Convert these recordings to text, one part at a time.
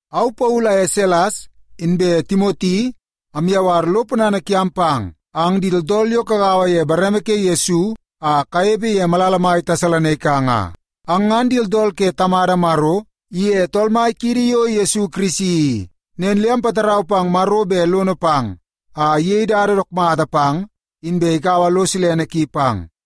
Au Paulu aye Silas inbe Timoti amyawar lo ponana kiam pang ang di tooltool yo kagaua ye bareme ke Yesu a kanepe ye malala mai Tesalonaika nga. Ang ngan di tooltool ke Tamada Maro iye Tool Mai kiidi yo Yesu Kirisi i. Nen le ampatarau pang Maro bet lono pang a iyei dada dook mata pang, inbe ikaua lo silene ki pang.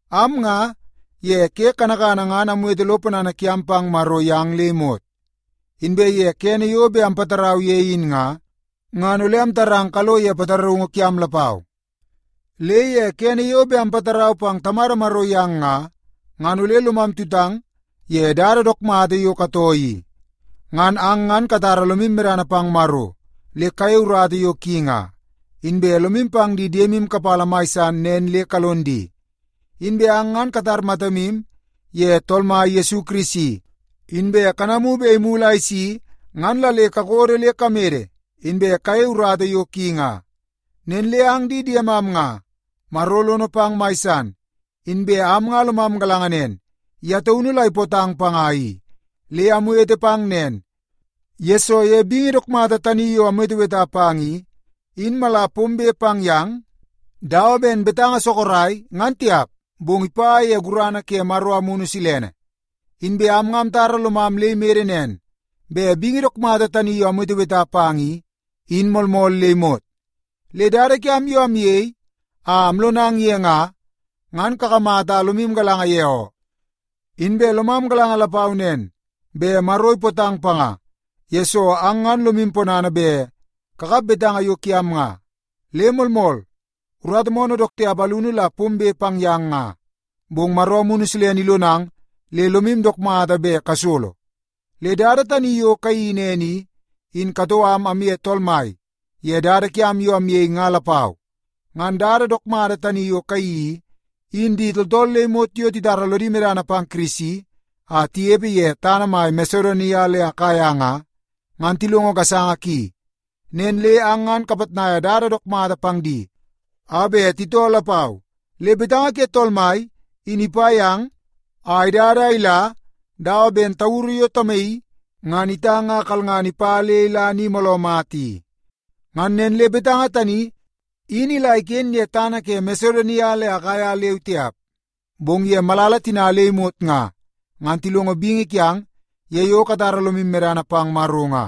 Am nga, ye ke kanakana ngan amwete lo ponana kiam pang Maro yang le imot. Inbe ye kene yo bet ampatarau ye in nga, ngan ole amtarang kalo ye pataraungu kiam lapau. Le ye kene yo bet ampatarau pang Tamada Maro yang nga, ngan ole lomam tutang ye dada dook mata yo katoo i. Ngan ang ngan katara lomu medana pang Maro le kayei urata yo ki nga, inbe lomu pang di diemu kapala mai san nen le kalon di. Inbe ang ngan katar matamu ye Tool Mai Yesu Kirisi, inbe kanamu bet imulu a isi, ngan la le kakodo le kamede, inbe kayei urata yo ki nga. Nen le ang di diemam nga, Maro lono pang mai san, inbe am nga lomam galanga nen, ye taunu la ipootang panga i. Le amwete pang nen, yesoo ye bingi dook mata tani yo amweteweta pang i, in mala pombe pang yang dawa ben betanga sorok ngan tiap, bong ipa ye gurana ke Maro Amunu Silene. Inbe am nga amtara lomam le imede nen bet bingi dook mata tani yo amweteweta pang i, in moolmool le imot. Le dada kiam yo amyei a amlonang ye nga, ngan kakamata a lomu galanga ye oo. Inbe lomam galanga lapau nen, bet Maro ipootang panga, yesoo ang ngan lomu ponana bet kakap betanga yo kiam nga. Le moolmool, urata moonoo dook tiap alunu la pombe pang yang nga, bong Maro Amunu Silene ilonang le lomu dook mata bet kasolo. Le dada tani yo kayeii nen i, in katoo am amye Tool Mai ye dada kiam yo amyei nga lapau. Ngan dada dook mata tani yo kayeii i, in di tooltool le imot yo titara lodi medana pang Kirisi a tinepe ye tana mai Masedonia le Akaia nga, ngan tilongo gasanga ki. Nen le ang ngan kapitnaia dada dook mata pang di a bet titoo lapau. Le betanga ke Tool Mai in ipa yang a idada a ila dawa ben tauru yo tamaii ngan itang a kalngana ipa le ila ni mooloo mata i. Ngan nen le betanga tani in ila iken ye tana ke Masedonia le Akaia leu tiap, bong ye malala tina le imot nga, ngan tilongo bingi kiang ye yo katara lomu medana pang Maro nga.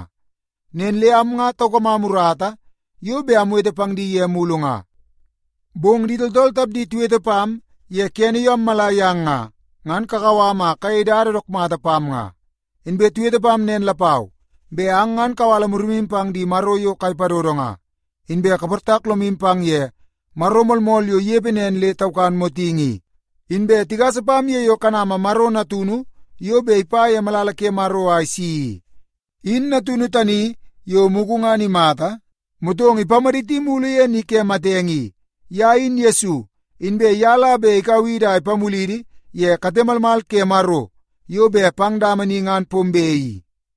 Nen le am nga taukamam urata yo bet amwete pang di ye mulu nga. Bong di tooltool tapdi tiwete pam ye kene yo ammala yang nga, ngan kakau am a kayei dada dook mata pam nga. Inbe tiwete pam nen lapau bet ang ngan kawala murimu pang di maro yo kai padodo nga, inbe kaportak lomu pang ye Maro moolmool yo inepe nen le taukan motingi i. Inbe tigasa pam ye yo kanama Maro Natunu yo bet ipa ye malala ke Maro a isi i. In Natunu tani yo mugu ngan imata, motong ipamaditi mulu ye ni ke matenge i. Ye in Yesu, inbe ye la bet ikau idi a ipamulidi ye kate malmal ke Maro yo bet pang dama ni ngan pombe i.